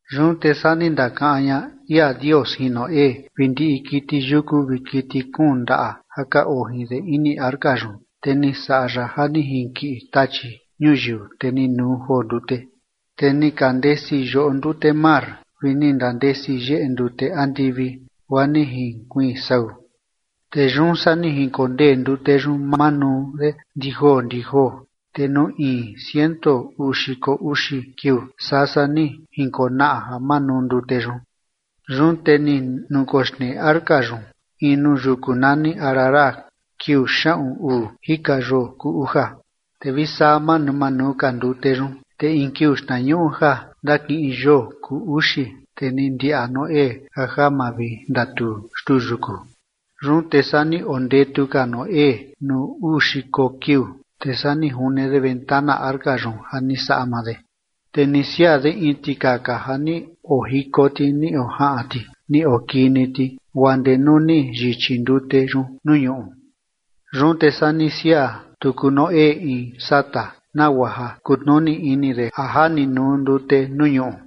Yun te saa ni ndakaꞌan ña ia Dios jin Noé vi ndiꞌi kiti yuku vi kiti kuun ndaꞌa ja ka oo jin de ini arca yun, te ni saꞌa ya ja ni jinkiꞌi tachi ñuyiu, te ni nuu joo ndute. Te ni ka ndandesi yoꞌo ndute mar vi ni ndandesi yeꞌe ndute andivi guaa ni jinkuiin sau. Te yun saa ni jinkondee ndute yun manuu de ndi joo ndi joo, te nuu in ciento uu xiko uxi kiuu saa saa ni jinkonaꞌa ja manuu ndute yun. Yun te ni nukoxnee arca yun in nuu yuku nani Ararat kiuu xaꞌun uu jika yoo kuu uja. Te vi saa manuu manuu ka ndute yun, te in kiuu xtnañuꞌu ja ndakiꞌin yoo kuu uxi, te ni ndiaꞌa Noé ja ja mavindatuu xtuu yuku. Yun te saa ni ondetu ka Noé nuu uu xiko kiuu, te saa ni june de ventana arca yun ja ni saꞌa maa de. Te ni siaa de in tikaka ja ni ojiko ti ni ojaꞌan ti ni okii ni ti, guaa ndee nuu ni yichi ndute yun nuu ñuꞌu. Yun te saa ni siaa tuku Noé in sata, nagua ja kutnuni ini de a ja ni nuu ndute nuu ñuꞌu.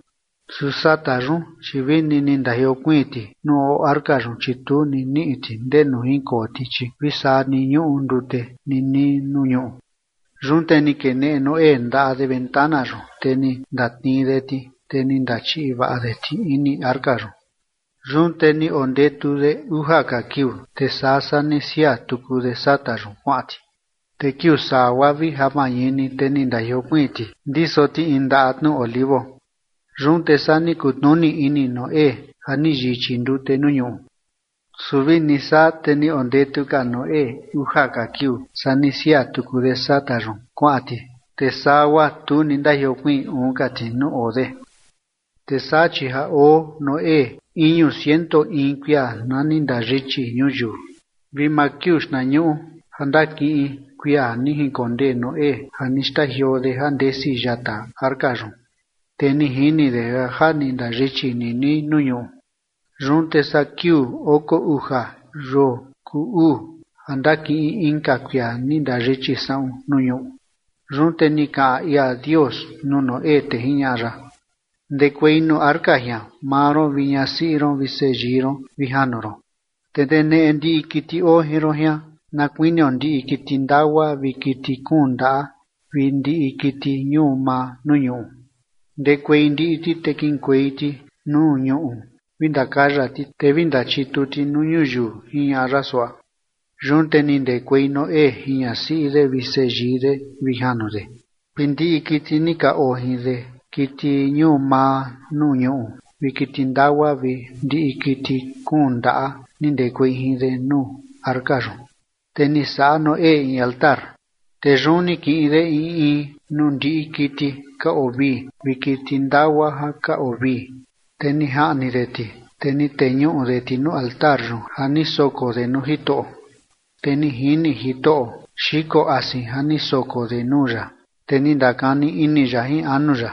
Su sata yun, chi vini ni ndajiokuiin ti nuu oo arca yun, chi tu ni niꞌi ti ndenu jinkoo ti, chi vi saa ni ñuꞌu ndute ninii nuu ñuꞌu. Yun te ni keneꞌe Noé ndaꞌa de ventana yun, te ni ndatnii de ti, te ni ndachiꞌi vaꞌa de ti ini arca yun. Yun te ni ondetu de uja ka kiuu, te saa saa ni siaa tuku de sata yun kuaꞌan ti. Te kiuu saa guaa vi ja mañini, te ni ndajiokuiin ti ndiso ti in ndaꞌa tnu olivo. Yun te saa ni kutnuni ini Noé ja ni yichi ndute nuu ñuꞌu. Su vini saa te ni ondetu ka Noé uja ka kiuu saa ni siaa tuku de sata yun kuaꞌan ti, te saa guaa tu ni ndajiokuiin uun ka ti nuu oo de. Te saa chi ja oo Noé iñu ciento in kuia na ni ndayichi ñuyiu, vi maa kiuu xtnañuꞌu ja ndakiꞌin kuia ni jinkondee Noé ja ni xtajioo de ja ndesi yata arca yun, te ni jini de ja ja ni ndayichi ninii nuu ñuꞌu. Yun te saa kiuu oko uja yoo kuu uu ja ndakiꞌin inka kuia ni ndayichi saꞌun nuu ñuꞌu. Yun te ni kaꞌan ia Dios nuu Noé, te jiñaꞌa ya: ―Ndekuei nuu arca jian maa ron vi ñasiꞌi ron vi seyii ron vi janu ron, te ndeneꞌe ndiꞌi kiti oo jin ron jian na kuinio ndiꞌi kiti ndagua vi kiti kuun ndaꞌa vi ndiꞌi kiti ñuu maa nuu ñuꞌu, ndekuei ndiꞌi ti, te kiꞌinkuei ti nuu ñuꞌu vi ndakaya ti, te vi ndachitu ti nuu ñuyiu ―jiñaꞌa ya suaꞌa. Yun te ni ndekuei Noé jin ñasiꞌi de vi seyii de vi janu de, vi ndiꞌi kiti ni ka oo jin de kiti ñuu maa nuu ñuꞌu vi kiti ndagua vi ndiꞌi kiti kuun ndaꞌa ni ndekuei jin de nuu arca yun. Te ni saꞌa Noé in altar, te yun ni kiꞌin de in in nuu ndiꞌi kiti ka oo vii vi kiti ndagua ja ka oo vii, te ni jaꞌni de ti, te ni teñuꞌu de ti nuu altar yun ja ni soko de nuu Jitoꞌo. Te ni jini Jitoꞌo xiko asin ja ni soko de nuu ya, te ni ndakani ini ya jin anu ya: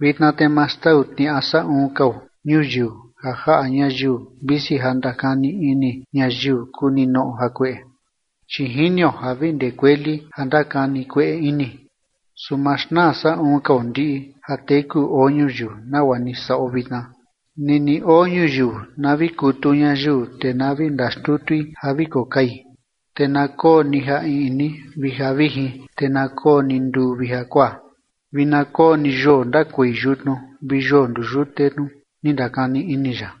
“Vitna te ma xtau tniaꞌa saꞌun kao ñuyiu ja jaꞌa ñayiu, visi ja ndakani ini ñayiu kuu ninoꞌo jakueꞌe, chi jinio ja vi ndee kueli ja ndakani kueꞌe ini. Su ma xnaa saꞌun kao ndiꞌi ja teku oo ñuyiu nagua ni saꞌo vitna. Nini oo ñuyiu na vi kutu ñayiu, te na vi ndaxtutui ja vi kokai, te na koo ni ja iꞌni vi ja vijin, te na koo ni nduu vi jakuaa, vi na koo ni yoo ndakuei yutnu vi yoo nduyute tnu”, ni ndakani ini ya.